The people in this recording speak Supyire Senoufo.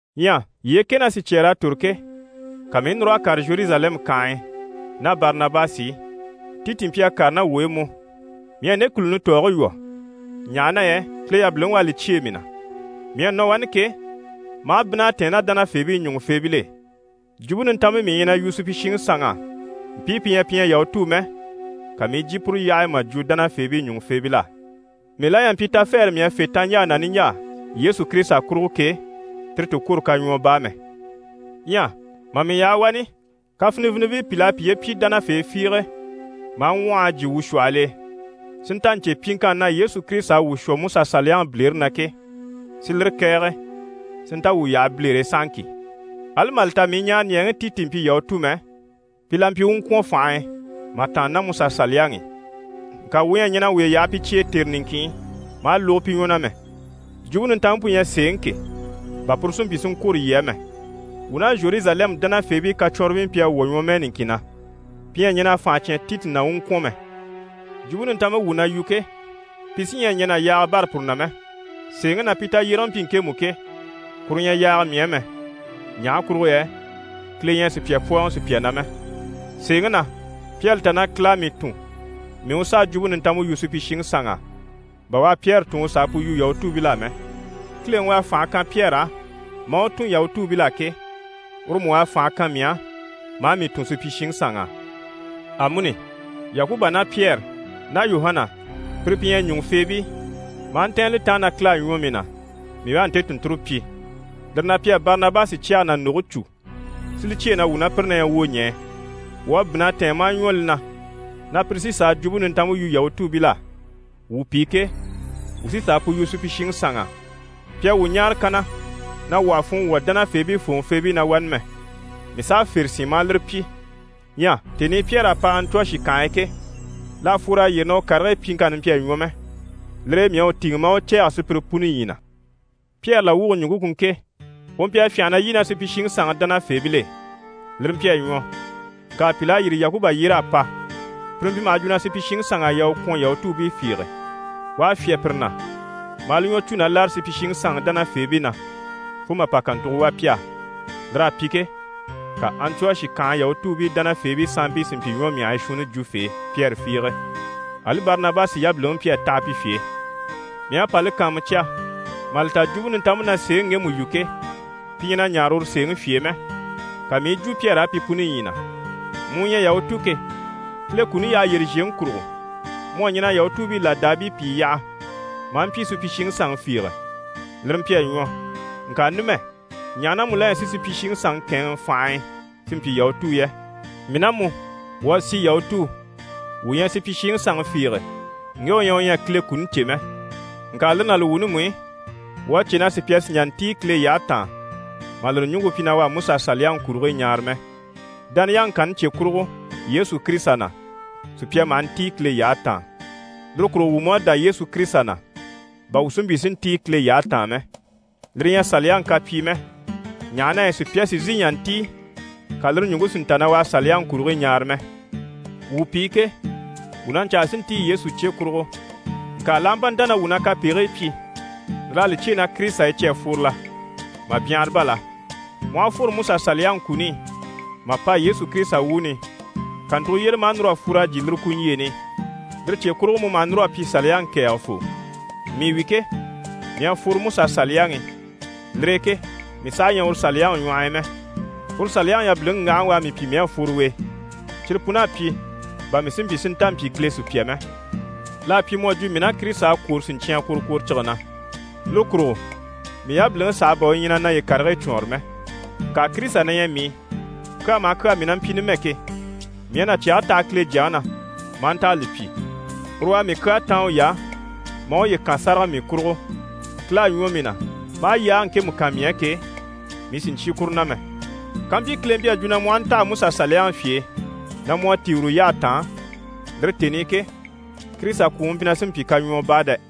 Ɲyɛ yyee kɛ ná sicyɛɛr'à tòro ke, ka mii i núr'a kàre Zheruzalɛmu kànhe e ná Barinabasi i. Titi mpyi a kàre ná wuu e mú. Mii à nde kùluni tɔɔge lwɔ́, ɲaha na yɛ Kile yabiliŋi u à li cyêe mii na. Mii à nɔ wani ke, maa bínn'a tɛ̀ɛn ná dánafeebii ɲùŋufeebil'e. Jwumpe Nintanmpe mii na yu supyishiŋi sanŋ'á, mpii pi ɲyɛ pi ɲyɛ Yahutuu mɛ, ka mii i jyè puru yyahe e mà jwo dánafeebii ɲùŋufeebil'á. Mii la ɲyɛ a mpyi tafɛɛre mii à fê taɲjaa ná niɲjaa Yesu Kirisita kurugo ke, tire ti kwôro kaɲwɔɔ baa mɛ. Ɲyɛ mà mii yaha wani, kafinivinibii pìi mpyi a piye pyi dánafee fiige maa ŋwɔhɔ a jyè wuu shwɔhɔl'e si nta ɲcè pyiŋkanni na Yesu Kirisita à wuu shwɔ MusaSaliyaŋi bilere na ke, si lire kɛ̀ɛge si nta wuu yaha bilere e sahaŋki. Ali mà li ta mii ɲaaraɲɛɛŋi Titi mpyi Yahutu mɛ, pi la mpyi u u ŋkwɔ̀n fànhe e mà tàanna ná Musa Saliyaŋi i. Ŋka wuu ɲyɛ a ɲɛn'a wuye yaha pi cye e tère niŋkin i, maa lógo pi ɲwɔ na mɛ, Jwumpe Nintanmpe pu ɲyɛ sèeŋi ke, bà puru si mpyi si ŋkwôro yii á mɛ. Wuu ná Zheruzalɛmu dánafeebii kacwɔnribii mpyi a wwɔ̀ ɲwɔmɛɛ niŋkin na, pi ɲyɛ a ɲɛn'a fànha cyán Titi na u u ŋkwɔ̀n mɛ. Jwumpe Nintanmpe wuu na yu ke, pi sí ɲyɛ a ɲɛn'a yaaga bâra puru na mɛ. (Sèeŋi na, pi tayyérege mpyi ŋkemu ke, kuru ɲyɛ yaaga mii á mɛ, ɲaha kurugo yɛ Kile ɲyɛ a sùpya pwɔ́ɔŋɔ sùpya na mɛ.) Sèeŋi na, pi à li ta na Kile à mii tun mii u sà a Jwumpe Nintanmpe yu supyishiŋi sanŋ'á, bà u à Pyɛri tun u sà a pu yu Yahutuubil'á mɛ. Kileŋi u à fànhe kan Pyɛri á maa u tun Yahutuubil'á ke, uru mú u à fànhe kan mii á maa mii tun supyishiŋi sanŋ'á. Amuni, Yakuba ná Pyɛri ná Yuhana pire pi ɲyɛ ɲùŋufeebii, maa ntɛ̀ɛn li taan na Kile à ɲwɔ mii na, mii u a nte tùnnture pyi. Lire na pi à Barinabasi cyɛge ná ndoge cû, si li cyêe na wuu ná pire na ɲyɛ wwoɲɛɛ. Wuu à bínn'a tɛ̀ɛn maa ɲwɔ li na na pire sí n‑sà a Jwumpe Nintanmpe yu Yahutuubil'á. Wuu pi ke, wuu sí n‑sà a pu yu supyishiŋi sanŋ'á. Pi à wuu ɲáare kanna na wuu àha funŋɔ wwɔ̀ dánafeebii fòŋɔfeebii na wani mɛ. Mii s'à fère sín maa lire pyi. Ɲyɛ tèni i Pyɛri à pa Antiyɔshi kànhe e ke, l'à fwor'a yyére na u karigii pyiŋkanni mpyi a ɲwɔ mɛ, lire e mii à u tìŋɛ maa u cɛ̂ɛgɛ sùpyire puni ɲyii na. Pyɛri làwwuge ɲùŋke ku ŋke: u mpyi a fyânha na lyî ná supyishiŋi sanŋi dánafeebil'e, lire mpyi a ɲwɔ, ŋka pìl'à yîri Yakuba yyér'a pa, pire mpyi maha jwo na supyishiŋi sanŋ'à yaa u kwɔ̀nYahutuubii fiige, u à fyá pire na, maa li ɲwɔ cû na láre supyishiŋi sanŋi dánafeebii na, fo mà pa kàntugo wà pi á. Lir'à pyi ke, ka Antiyɔshi kànhe Yahutuubii dánafeebii sanmpii si mpyi ɲwɔmyahigii shuunnifee Pyɛri fiige. Ali Barinabasi yabiliŋi mpyi a taha pi fye e. Mii à pa li kàanmucya mà li ta Jwumpe Nintanmpe na sèeŋi ŋgemu yu ke, pi ɲyɛ na ɲaare uru sèeŋi fye e mɛ, ka mii i yi jwo Pyɛri á pi puni ɲyii na: «Mu u ɲyɛ Yahutu ke, Kile kuni yyahe yyére zhèŋi kurugo mu à ɲɛn'a Yahutuubii làdaabii pìi yaha maa mpyi supyishiŋi sanŋi fiige, lire mpyi a ɲwɔ, ŋka numɛ, ɲaha na mu la ɲyɛ si supyishiŋi sanŋi kɛ̂ɛnŋɛ fànhe e si mpyi Yahutuu yɛ? Mii ná mu, wuu à si Yahutuu, wuu ɲyɛ supyishiŋi sanŋi fiige ŋge u ɲyɛ u ɲyɛ a Kile kuni cè mɛ. Ŋka lire ná li wuuni mú i, wuu à cè na sùpya sì n‑jà n‑tíi Kile yyahe taan mà lire ɲùŋke pyi na u à MusaSaliyaŋi kurigii ɲaara mɛ. Dániyaŋi kanni cye kurugo Yesu Kirisita na, sùpya maha ntíi Kile yyahe taan. Lire kurugo wuu mú à dá Yesu Kirisita na, bà wuu si mpyi si ntíi Kile yyahe taan mɛ. Lire ɲyɛ Saliyaŋi kapyii mɛ, ɲaha na yɛ sùpya sì n‑sìi n‑jà n‑tíi ka lire ɲùŋke si nta na u à Saliyaŋi kurigii ɲaara mɛ.» Wuu pi ke, wuu na ɲcaa si ntíi Yesu cye kurugo, ŋka l'aha mpa nta na wuu na kapegigii pyi, lir'à li cyêe na Kirisita e cyi à fworo la? Mà byanhara bá la! Mu aha fworo Musa Saliyaŋi kuni i mà pa Yesu Kirisita wuuni i, kàntugo yyére maa núr'a fwor'a jyè lire kuni niɲjyeeni i, lire cye kurugo mu maha núr'a pyi Saliyaŋi kɛ̀ɛgɛfoo. Mii wi ke, mii à fworo Musa Saliyaŋi i. Lire e ke mii saha ɲyɛ uru Saliyaŋi ɲwɔh'i mɛ. Uru Saliyaŋi yabiliŋi ŋgahaŋi u à mii pyi mii à fworo u e. Cyire pun'à pyi, bà mii si mpyi si nta mpyi Kile sùpya mɛ. L'à pyi mu à jwo mii ná Kirisita à kwòro siɲcyan kworokworocige na. Lire kurugo mii yabiliŋi sàha bà u ɲyɛ na naye karigii cwɔɔnre mɛ. Ŋka Kirisita na ɲyɛ mii i. Kyaa maha kyaa mii na mpyi numɛ ke, mii à na cyɛge taha Kile Jyaŋi na maa nta a li pyi. Uru u à mii kyaa táan uy'á, maa uye kan sáraga mii kurugo. Kile à ɲwɔ mii na maa yaage ŋkemu kan mii á ke, mii sì n‑cyé kuru na mɛ. Kàmpyi Kile mpyi a jwo na mu aha ntaha Musa Saliyaŋi fye e na mu à tíi uru yyahe taan, lire tèni i ke, Kirisita kwùŋi mpyi na sí n‑pyi kaɲwɔɔ baa dɛ!